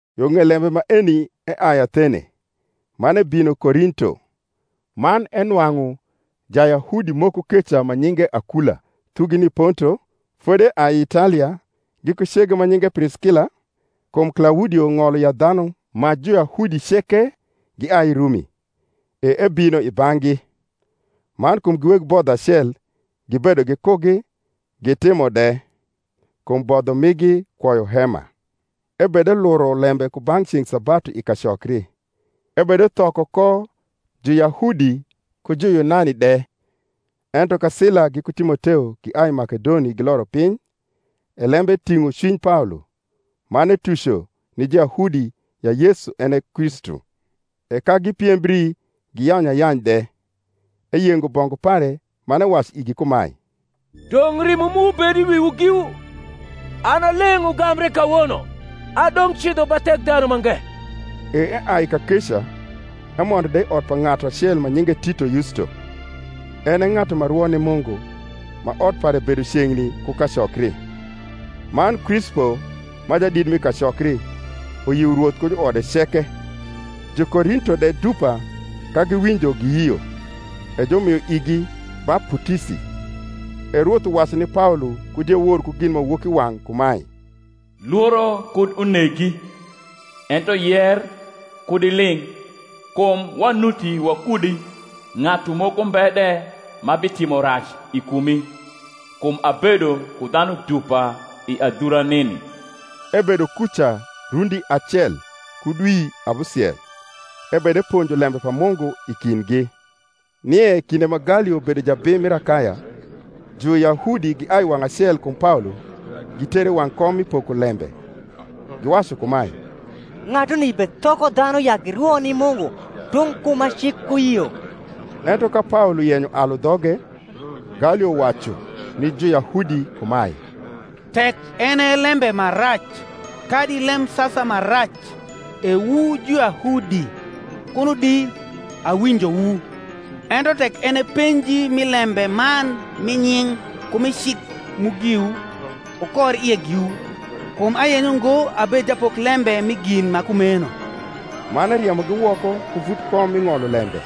Yo ng’ei lembe maeni eai Athene, man ebino Korinto. Man enwang’u Jayahudi moko keca ma nyinge Akula, thugi ni i Ponto, fodi eai i Italia, giku cege ma nyinge Priskila, kum Klaudio ng’olo ya dhanu ma Juyahudi ceke giai i Rumi: e ebino i bang’gi; man kum gi weg bodho acel, gibedo gikugi, gitimo de: kum bodho migi kwoyo hema. Ebedeluro lembe ku ba ceng’ sabatu i kacokri, ebedethoko ko Juyahudi ku Juyunani de. Ento ka Sila giku Timoteo giai i Makedoni giloro piny, e lembe ting’o cwiny Paolo, man etuco ni Juyahudi ya Yesu en e Kristu. E ka gipiembri giyanyu ayany de, eyengo bongu pare man ewacu igi kumae, Dong’ rimo mu bed i wiwu giwu; an a leng’ ugambre kawono adong’ cidho ba Thekdhanumange. E eai kakeca, emondo de i ot pa ng’atu acel ma nyinge Tito Yusto, en e ng’atu ma rwo ni Mungu, ma ot pare bedo ceng’ni ku kacokri. Man Krispo, ma jadit mi kacokri, uyio Rwoth ku juode ceke; Jukorinto de dupa ka giwinjo giyio, e jumio igi baputisi. E Rwoth uwacu ni Paolo ku diewor ku ginmawokiwang’ kumae, Lworo kud unegi, ento yer kud iling’: kum wanuti wakudi, ng’atu moko mbe de ma bitimo rac i kumi: kum abedo ku dhanu dupa i adhura nini. Ebedo kuca rundi acel ku dwi abusiel, ebedeponjo lembe pa Mungu i kindgi. Nie kinde ma Galio bedo jabim mir Akaya, Juyahudi giai wang’ acel kum Paolo gitere i wang’ kom mi pokolembe, giwacu kumae, Ng’atuni bethoko dhanu ya girwo ni Mungu tung’ ku ma cik uyio. Ento ka Paolo yenyo alu dhoge, Galio wacu ni Juyahudi kumae, Tek en e lembe ma rac kadi lem sasa ma rac, E wu Juyahudi, kuno di awinjowu: ento tek en e penji mi lembe man mi nying’ ku mi cik mu giwu, wukor ie giwu; kum ayenyo ngo abed japoklembe mi gin ma kumeno. Man eriemogi woko ku vut kom mi ng’olo lembe.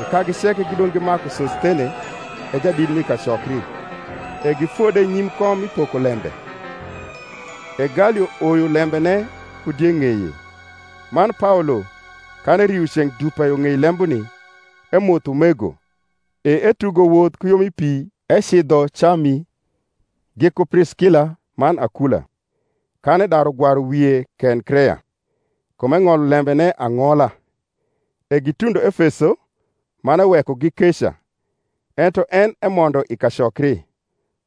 E kagi ceke gidong’ gimaku Sosthene, e jadit mi kacokri, e gifode nyim kom mi pokolembe. E Galio oyo lembene ku die ng’eye. Man Paolo, kan erio ceng’ dupa yo ng’ei lembuni, emotho umego, e etugo woth ku yo mi pi ecidho Cami, giku Priskila man Akula: kan edaru gwaru wie Kenkrea; kum eng’olo lembene ang’ola. E gitundo Efeso, man ewekogi keca: ento en emondo i kacokri,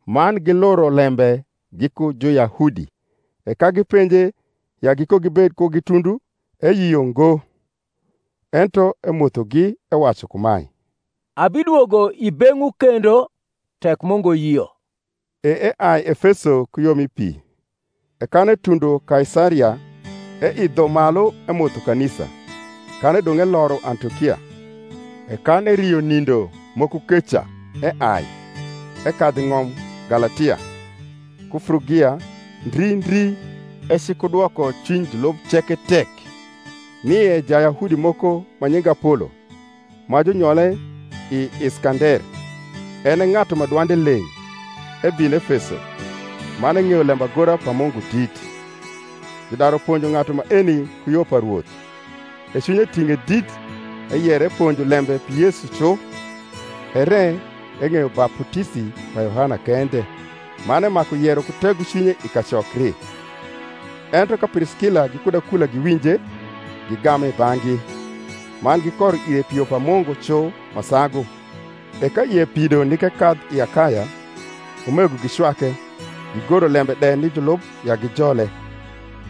man giluro lembe giku Juyahudi. E ka gipenje ya gikogibed kugi tundu, eyio ngo; ento emothogi, ewacu kumae, Abidwogo i beng’wu kendo tek Mungu yio, e eai Efeso ku yo mi pi. E kan etundo Kaisaria, eidho malu emotho kanisa, kan edong’ eloro Antiokia. E kan erio nindo moko keca, eai, ekadhu i ng’om Galatia, ku Frugia, ndri ndri, ecikudwoko cwiny julub ceke tek. Nie Jayahudi moko ma nyinge Apolo, ma junyole i Iskander, en e ng’atu ma dwande leng’, ebino Efeso; man eng’eyo lembagora pa Mungu dit. Judaru ponjo ng’atu maeni ku yo pa Rwoth; e cwinye ting’e dit eyero eponjo lembe pi Yesu cu, ere eng’eyo baputisi pa Yohana kende: man emaku yero ku tegocwinye i kacokri. Ento ka Priskila gikud Akula giwinje, gigame i bang’gi, man gikoro ire pi yo pa Mungu cu ma sagu. E ka ie pido nik ekadh i Akaya, umego gicwake, gigoro lembe de ni julub ya gijole: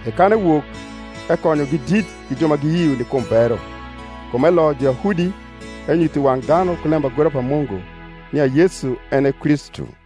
e kan ewok, ekonyogi dit gi ju ma giyio ni kum bero; kum eloyo Juyahudi, enyutho i wang’ dhanu ku lembagora pa Mungu nia Yesu en e Kristu.